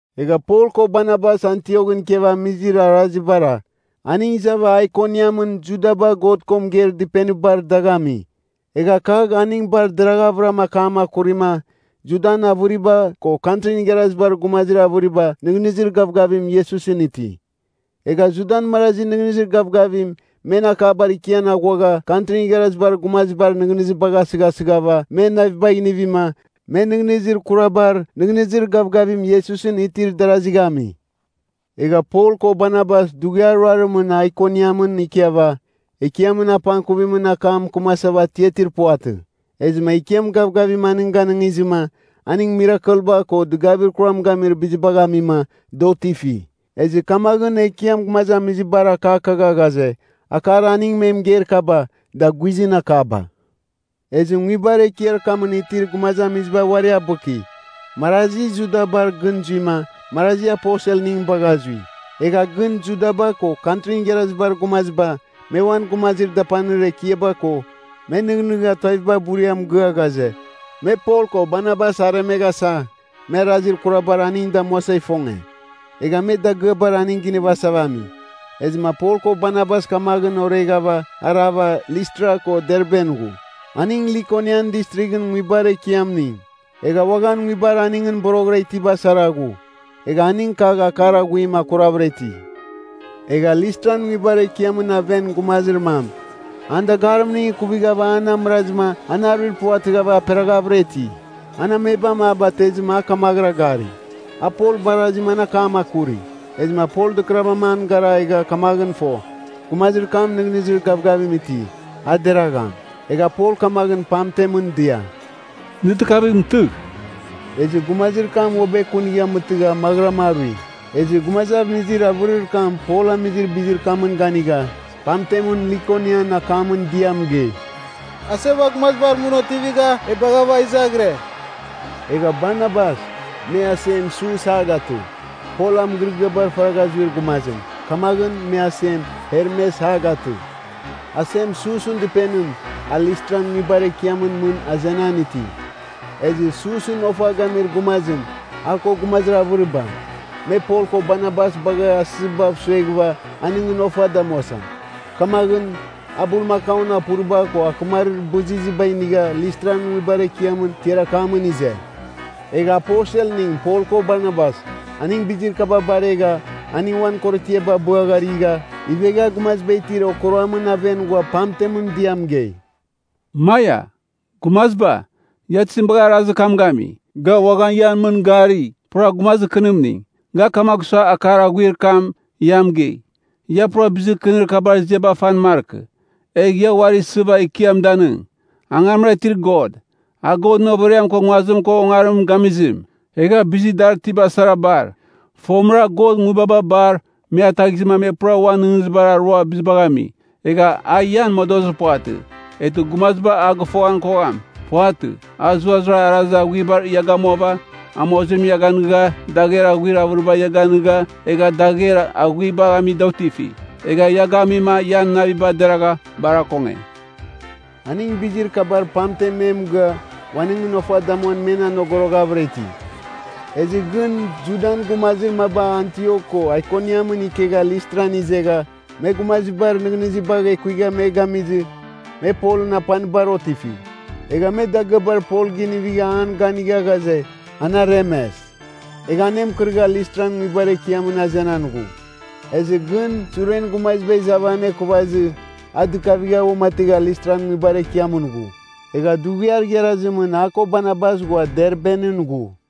Egha Pol ko Barnabas Antioghɨn ikiav amizir arazibara, aning izava Aikoniamɨn Judaba God ko mɨgeir dɨpenibar dagh ami. Egha kagh aning bar deraghvɨra akam akurima, Judan avɨriba ko Kantrin Igharazibar Gumazir avɨriba nɨghnɨzir gavgavim Iesusɨn iti. Egha Judan marazi nɨghnɨzir gavgavim men akabar ikian aghuagha Kantrin Igharazibar Gumazibar nɨghnɨzibagh asɨghasɨghava men navibagh inivima, me nɨghnɨzir kurabar nɨghnɨzir gavgavim Iesusɨn itir darazigh ami. Egha Pol ko Barnabas dughiar ruarimɨn Aikoniamɨn ikiava, Ekiamɨn apangkuvimɨn akam mɨkɨmasava atiatir puvatɨ. Ezɨma Ekiam gavgavim aning ganɨngizɨma, aning mirakelba ko dɨgavir kuram gamir bizibagh amima, da otifi. Ezɨ kamaghɨn Ekiam gumazamizibar akakagha ghaze, akar aning me mɨgeir kaba, da guizɨn akaba. Ezɨ nguibar ekiar kamɨn itir gumazamiziba uari abɨki, marazi Judabar gɨn zuima, marazi aposelning bagha zui. Egha gɨn Judaba ko Kantrin Igharazibar Gumaziba, me uan gumazir dapanir ekiaba ko, me nɨghnɨgha tuaviba buria mɨgɨa ghaze, me Pol ko Barnabas aremeghasa, me arazir kurabar aning damuasa ifonge. Egha me dagɨabar aning ginivasava ami. Ezɨma Pol ko Barnabas kamaghɨn oreghava arava Listra ko Derben ghu, aning Likonian Distrighɨn nguibar ekiamning. Egha uaghan nguibar aningɨn boroghɨra itiba sara ghu. Egha aning kagh akar aghuim akuravɨra iti. Egha Listran nguibar ekiamɨn aven gumazir mam, an dagarimning ikuvighava an amɨrazɨma an aruir puvatɨghava aperaghavɨra iti. An amebam a batezɨma a kamaghɨra gari. A Pol barazima an akam akuri. Ezɨma Pol dɨkɨravɨram an gara egha kamaghɨn fo, gumazir kam nɨghnɨzir gavgavim iti, a deragham. Egha Pol kamaghɨn pamtemɨn dia, “Nɨ dɨkavigh mɨtɨgh!” Ezɨ gumazir kam uabɨ ekunigha mɨtɨgha maghɨram arui. Egha gumazamizir avɨrir kam Pol amizir bizir kamɨn ganigha, pamtemɨn Likonian akamɨn dia mɨgei, “Aseba gumazibar mɨn otivigha e baghava izaghire!” Egha Barnabas, me asem Sus a gatɨ. Pol a mɨgɨrɨgɨabar faragha zuir gumazim, kamaghɨn me asem Hermes a gatɨ. Asem Susɨn dɨpenim, a Listran nguibar ekiamɨn mɨn azenan iti. Ezɨ Susɨn ofa gamir gumazim, a ko gumazir avɨriba, me Pol ko Barnabas bagha asɨzibav sueghɨva aningɨn ofa damuasa. Kamaghɨn, a bulmakaun apuriba ko akɨmarir bɨzizɨba inigha Listran nguibar ekiamɨn tiar akamɨn ize. Egha aposelning Pol ko Barnabas, aning bizir kaba baregha, aning uan korotiaba abɨagharigha, ivegha gumaziba itir okuruamɨn aven ghua pamtem dia mɨgei, “Maia! Gumaziba, ia tizim bagha arazir kam gami? Ga uaghan ian mɨn gari, pura gumazir kɨnimning. Ga kamagh sua akar aghuir kam ia mɨgei. Ia pura bizir kɨnir kabar ziaba fan markɨ. Egh ia uari isɨva Ekiam danɨng, angamra itir God. A Godɨn overiam ko nguazim ko ongarim gamizim, egha bizir dar itiba sara bar. Fomɨra, God nguibaba bar, me ataghizɨma me pura uan nɨghnɨzibar arua bizibagh ami. Egha a ian modozir puvatɨ, eghtɨ gumaziba a gɨfoghan kogham. puvatɨ. A zuraram arazir aghuibar ia gamuava, amozim ia ganɨga, dagher aghuir avɨriba ia ganɨga egha dagher aghuibagh ami da otifi. Egha ia gamima ian naviba deragha bar akonge.” Aning bizir kabar pamten me mɨgɨa, uaningɨn ofa damuan men anogoroghavɨra iti. Ezɨ gɨn Judan gumazir maba Antiok ko Aikoniamɨn ikegha Listran izegha, me gumazibar nɨghnɨzibagh ekuigha me gamizɨ, me Polɨn apanibar otifi. Egha me dagɨabar Pol ginivigha an ganigha ghaze, an aremes. Egha anemɨkɨrɨgha Listran nguibar ekiamɨn azenan ghu. Ezɨ gɨn suren gumaziba izava anekuvazɨ, a dɨkavigha uamategha Listran nguibar ekiamɨn ghu. Egha dughiar igharazimɨn a ko Barnabas ghua Derben zui.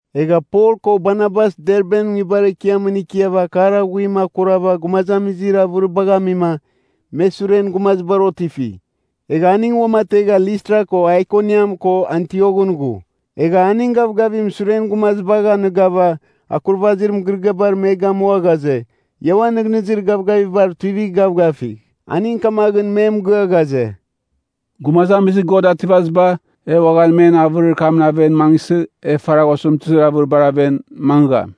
Egha Pol ko Barnabas Derben nguibar ekiamɨn ikiava akar aghuim akurava gumazamizir avɨribagh amima, me suren gumazibar otifi. Egha aning uamategha Listra ko Aikoniam ko Antioghɨn ghu. Egha aning gavgavim suren gumazibagh anɨghava akurvazir mɨgɨrɨgɨabar me gamua ghaze, ia uan nɨghnɨzir gavgavibar tuivigh gavgafigh. Aning kamaghɨn me mɨgɨa ghaze, “Gumazamizir God Ativaziba, e uaghan men avɨrir kamɨn aven mangɨsɨ, e faragh osɨmtɨzir avɨribar aven mangɨgham.”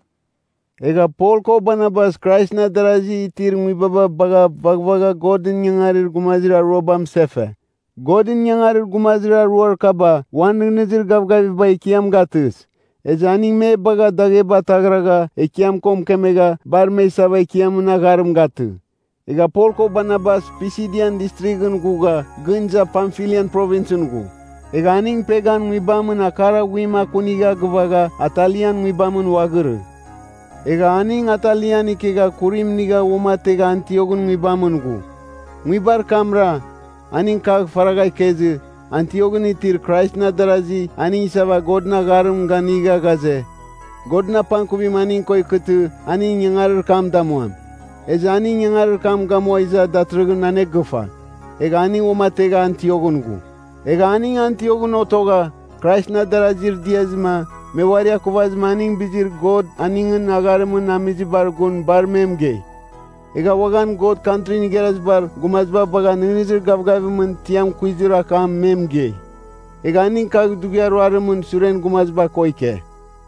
Egha Pol ko Barnabas Kraisɨn adarazi itir nguibaba bagha vaghvagha Godɨn ingangarir gumazir aruaba amɨsefe. Godɨn ingangarir gumazir aruar kaba uan nɨghnɨzir gavgaviba Ekiam gatɨs. Ezɨ aning me bagha dagheba taghragha Ekiam ko mɨkemegha bar me isava Ekiamɨn agharim gatɨ. Egha Pol ko Barnabas Pisidian Distrighɨn ghugha gɨn iza Pamfilian Provinsɨn ghu. Egha aning Pergan nguibamɨn akar aghuim akunigha gɨvagha Atalian nguibam uaghirɨ. Egha aning Atalian ikegha kurim inigha uamategha Antioghɨn nguibamɨn ghu. Nguibar kamra, aning kagh faragha ikezɨ, Antioghɨn itir Kraisɨn adarasi aning isava Godɨn agharim ganɨnga ghaze, Godɨn apangkuvim aning ko ikɨtɨ aning ingangarir kam damuam. Ezɨ aning ingangarir kam gamua iza datɨrɨghɨn anegɨfa. Egha aning uamategha Antioghɨn ghu. Egha aning Antioghɨn otogha, Kraisɨn adarazir diazɨma me uari akuvazɨma aning bizir God aningɨn agharimningɨn amizibar gun bar me mɨgei. Egha uaghan God Kantrin Igharazibar Gumaziba bagha nɨghnɨzir gavgavimɨn tiam kuizir akam me mɨgei. Egha aning kagh dughiar ruarimɨn suren gumaziba ko ike.